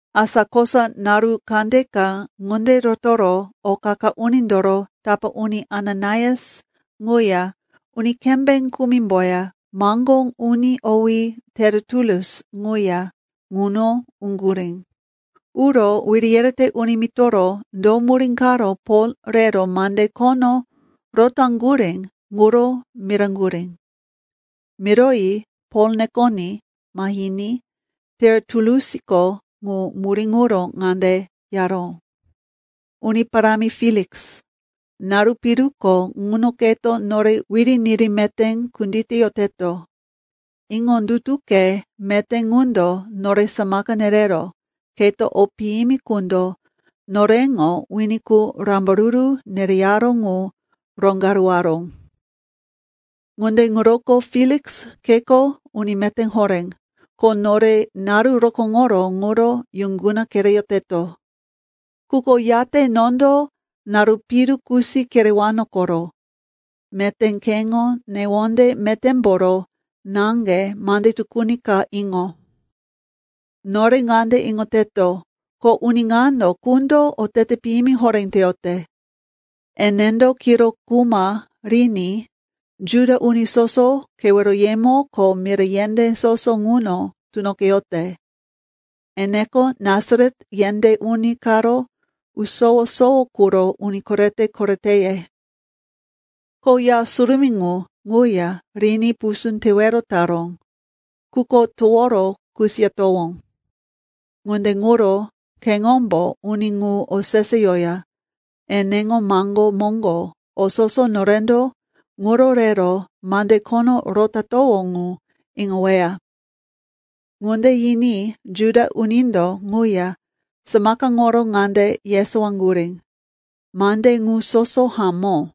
Asa kosa naru kandeka ŋunde rotoro o qa-qa unindoro tapá uni Ananias ŋuya uni kembé kumimboya maŋgó uni owí Teritulus ŋuya ŋuno uŋgurí. Uro wiri yerete uni mitoro do murí karo Pol rero mande khono rotaŋgurí ŋuro miraŋgurí. Miroyi Pol nekoní mahiní Teritulusko ŋu murí ŋuro ŋande yaró, “Uni parámi Feliks, naru piruko ŋuno keto nore wiri niri meté kunditeyoteto. Iŋondutuke meté ŋundo nore samaka nerero keto o piyimi qundo noreŋo wini qu rambaruru nereyaró ŋu roŋgaruwaró. Ŋunde ŋuroko Feliks, keko uni meté horé, ko nore naru rokóŋoro ŋuro yuŋguna kereyoteto. Quko yate nondo naru piru kusi kerewano koro. Meté keŋo newonde metémboro naŋge mande tukuni ka iŋo. “Nore ŋande iŋoteto, ko uni ŋano qundo otete piyimi horé teyote. Enendo kiro kuma riní Juda uni soso keweroyemo ko mira yendé soso ŋuno tunoqeyote. Eneko Nasaret yendé uni karo usowo-sowo quro uni korete-koreteye. Ko Ya Surumí ŋu ŋuya riní pusú tewero taró, quko toworo kusiyatowó. Ŋunde ŋuro keŋombo uni ŋu oseseyoya eneŋo maŋgó moŋgo o soso norendo ŋuro rero mande khono rotatowó ŋu iŋoweya.” Ŋunde yiní Juda unindo ŋuya samakaŋoro ŋande yesowaŋgurí, “Mande ŋu soso hamó.”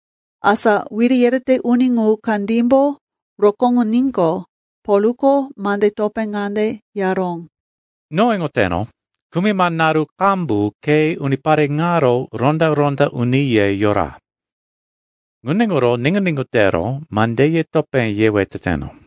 Asa wiri yerete uni ŋu kandímbo rokóŋoníqo, Polko mande topé ŋande yaró, “No iŋoteno, kumima naru qambu ke unipare ŋaro ronda-ronda uniye yora. Ŋunde ŋuro niŋgu-niŋgu tero mandeye topé yewe teteno.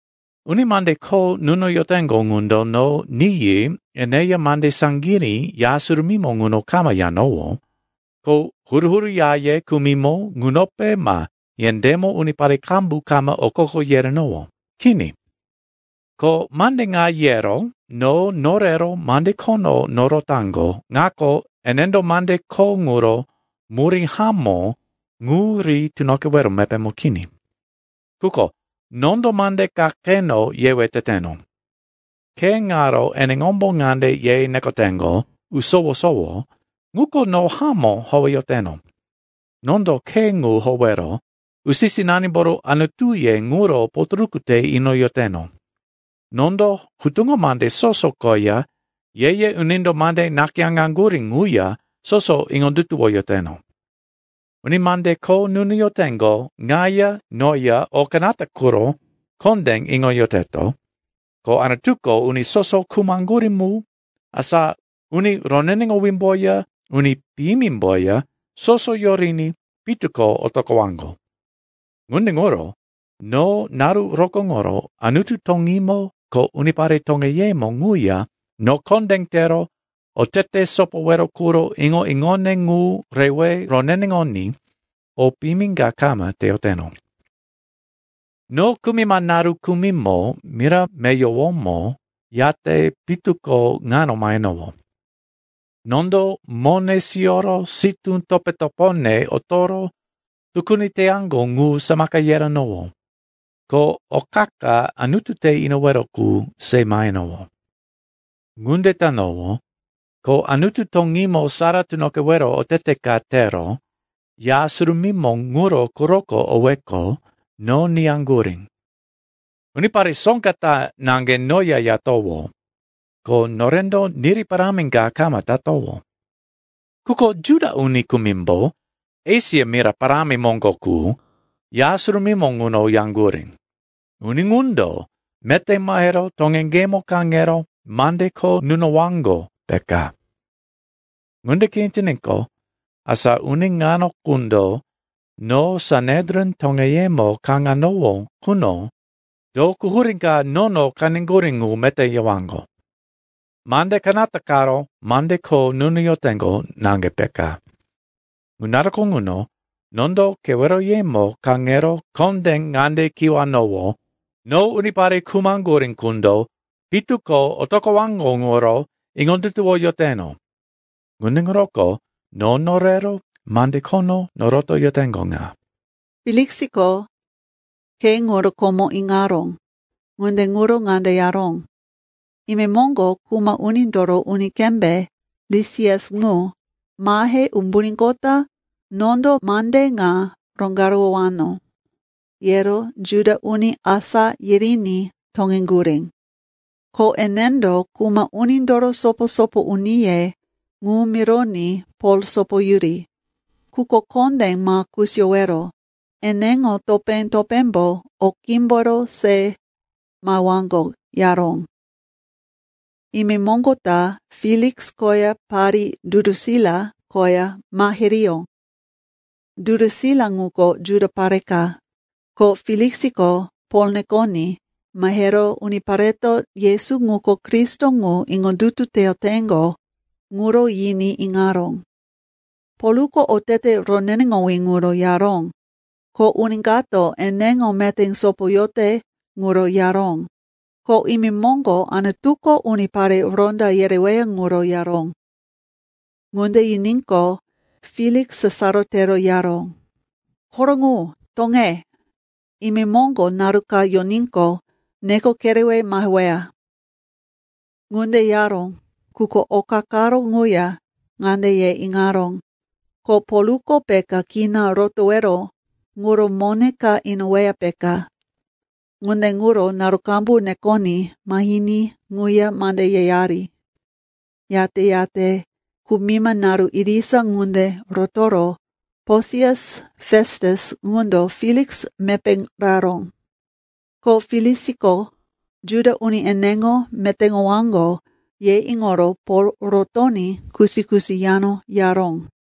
Uni mande kho nunoyoteŋgo ŋundo no niyi eneya mande saŋgirí Ya Surumímo ŋuno kama yanowó, ko huru-huru yaye kumimo ŋunope ma yendémo unipare qambu kama okoko yerenowó. Kini. Ko mande ŋa yero no norero mande khono norotaŋgo ŋako, enendo mande kho ŋuro murí hamó ŋu ri tunoqewero mepémo kini. Quko nondo mande ka keno yewe teteno. Khe ŋaro eneŋombo ŋande ye nekoteŋgo, ‘Usowo-sowo,’ ŋuko no hamó howeyoteno. Nondo Khe ŋu howero usi-sinanimboro Anutuye ŋuro potoruku te inoyoteno. Nondo Hutuŋo Mande soso koya Ye-ye Unindo mande nakayáŋaŋgurí ŋuya soso iŋondutuwoyoteno. Uni mande kho nunoyoteŋgo ŋaya noya o kanata quro kondé iŋoyoteto, ko Anutuko uni soso khumaŋgurí mu, asa uni roneneŋowímboya uni piyimimboya soso yoriní pitu ko otoqowaŋgo. Ŋunde ŋuro no naru rokóŋoro Anutu toŋímo ko unipare toŋeyemo ŋuya no kondé tero otete sopowero quro iŋo-iŋone ŋu rewe roneneŋoní o piyimi ka kama teyoteno. “No kumima naru kumimo mira meyowomo yate pitu ko ŋano mahenowó. Nondo mone siyoro sitú topo-topone otoro tukuni teyaŋgo ŋu samaka yerenowó, ko o qa-qa Anutu te inowero qu se mahenowó. Ŋunde tanowó, ko Anutu toŋímo sara tunoqewero otete ka tero Ya Surumímo ŋuro quroko oweqo, no niyaŋgurí. Unipare soŋga ta naŋge noya yatowó. Ko norendo niri parámi ka kama tatowó. Quko Juda uni kumimbo Esia mira parámi moŋgo qu Ya Surumímo ŋuno yaŋgurí. Uni ŋundo meté mahero toŋeŋgemo kaŋero mande kho nunowaŋgo, peka. Ŋunde kini tiníqo, asa uni ŋano qundo no Sanedrin toŋeyemo kaŋanowó quno do quhurí ka nono qeneŋgurí ŋu meté yewaŋgo. Mande kanata karo mande kho nunoyoteŋgo naŋge, peka. Ŋu naruko ŋuno nondo keweroyemo kaŋero kondé ŋande kiwanowó, ‘No unipare khumaŋgurí qundo pitu ko otoqowaŋgo ŋuro iŋondutuwoyoteno. Ŋunde ŋuroko no norero mande khono norotoyoteŋgo ŋa.’” Feliksiko Khe ŋuro komo iŋaró, ŋunde ŋuro ŋande yaró, “Imemoŋgo kuma unindoro uni kembé, Lisias ŋu, mahe umbuníqota nondo mande ŋa roŋgaruwowano,” yero Juda uni asá yiriní toŋeŋgurí. Ko enendo kuma unindoro sopo-sopo uniye ŋu mironí Pol sopoyuri, quko kondé ma kusiyowero, eneŋo topé-topémbo o qímboro se mahewaŋgo, yaró. Imemoŋgo ta Feliks koya parí Durusila koya mahiriyó. Durusila ŋuko Juda pare ka. Ko Feliksiko Pol nekoní mahero unipareto Yesu ŋuko Kristo ŋu iŋondutu teyoteŋgo ŋuro yiní iŋaró. Polko otete roneneŋowí ŋuro yaró, ko uni kato eneŋo meté sopoyote ŋuro yaró, ko imemoŋgo Anutuko unipare ronda yereweya ŋuro yaró. Ŋunde yiníqo, Feliks sasaro tero yaró, “Koro ŋu! Toŋe. Imemoŋgo naru ka yoníqo, neko kerewe maheweya.” Ŋunde yaró, quko oka karo ŋuya ŋande ye iŋaró, ko Polko peka kina rotowero ŋuro mone ka inoweya, peka. Ŋunde ŋuro naru qambu nekoní mahiní ŋuya mande yeyari. Yate-yate kumima naru irisa ŋunde rotoro Posias Festus ŋundo Feliks mepé raró. Ko Feliksiko, Juda uni eneŋo metéŋowaŋgo, ye iŋoro Pol rotoní kusi-kusi yano yaró.